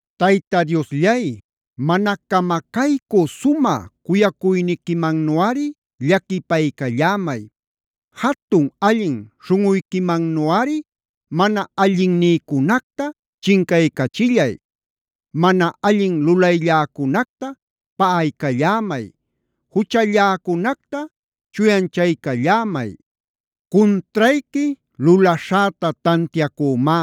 Tayta Diosllay, mana camacaycü sumä cuyacuyniquimannuꞌari llaquipaycallämay. Jatun allin śhunꞌuyquimannuꞌari mana allinnïcunacta chincaycachillay. Mana allin lulaylläcunacta paꞌaycallämay. Juchalläcunacta chuyanchaycallämay. Cuntrayqui lulaśhäta tantiacümá.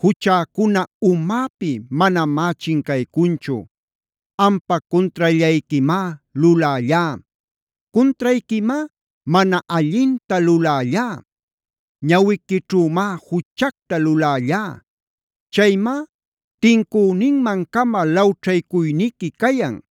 Juchäcuna umäpi manamá chincaycunchu. Ampa cuntrallayquimá lulällá. Cuntrayquimá mana allinta lulällá. Ñawiquićhümá juchacta lulällá.b Chaymá tincüninman-cama lawćhaycuyniqui cayan.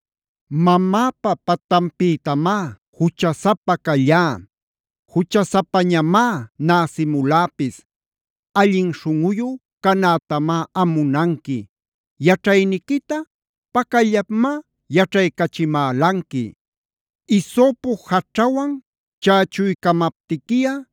Mamäpa patanpïtamá juchasapa callá. Juchasapañamá näsimuläpis. Allin śhunꞌuyu canätamá am munanqui. Yaćhayniquita pacallapmá yaćhaycachimälanqui. Hisopod jaćhawan chächuycamaptiquiꞌa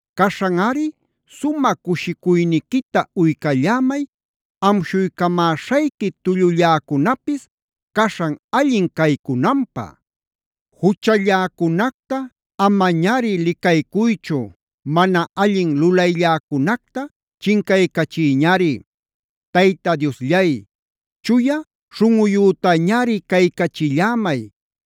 Caśhanꞌari sumä cushicuyniquita uycallämay amshuycamäśhayqui tullulläcunapis caśhan allin caycunanpä. Juchalläcunacta amañari licaycuychu. Mana allin lulaylläcunacta chincaycachiyñari. Tayta Diosllay, chuya śhunꞌuyütañari caycachillämay.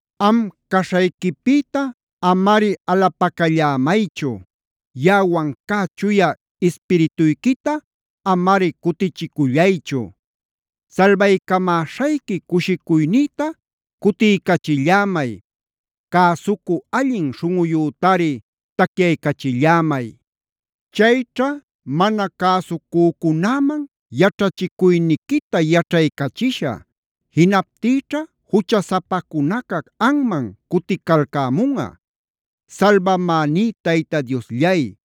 Am caśhayquipïta amari alapacallämaychu. Yaꞌawan cä Chuya Ispirituyquita amari cutichicullaychu. Salbaycamäśhayqui cushicuynïta cutiycachillämay. Cäsucü allin śhunꞌuyütari tacyaycachillämay. Chayćha mana cäsucücunäman yaćhachicuyniquita yaćhaycachishä. Jinaptïćha juchasapacunaca anman cuticalcämunꞌa. Salbamäní Tayta Diosllay,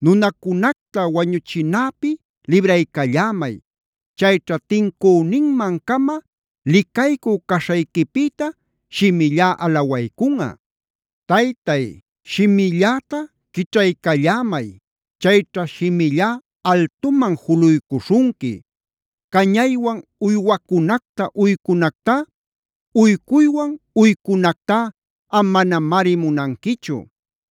nunacunacta wañuchinäpi libraycallämay. Chayćha tincüninman-cama licaycü caśhayquipïta shimillá alawaycunꞌa. Taytay, shimilläta quićhaycallämay. Chayćha shimillá altuman juluycuśhunqui. Cañaywan uywacunacta uycunactá, uycuywan uycunactá am manamari munanquichu.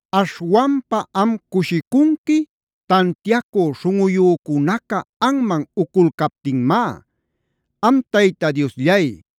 Aśhwanpa am cushicunqui tantiacü śhunꞌuyücunaca anman uculcaptinmá. Am Tayta Diosllay,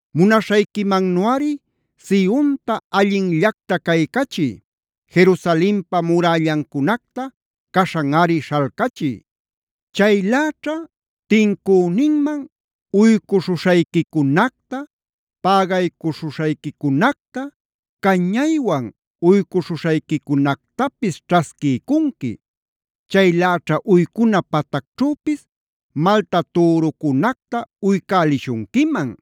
Munaśhayquimannuꞌari Sionta allinllacta caycachiy. Jerusalenpa murällancunacta caśhanꞌari śhalcachiy. Chayläćha tincüninman uycuśhuśhayquicunacta, pägaycuśhuśhayquicunacta, cañaywan uycuśhuśhayquicunactapis ćhasquiycunqui. Chayläćha uycuna patacćhüpis malta türucunacta uycälishunquiman.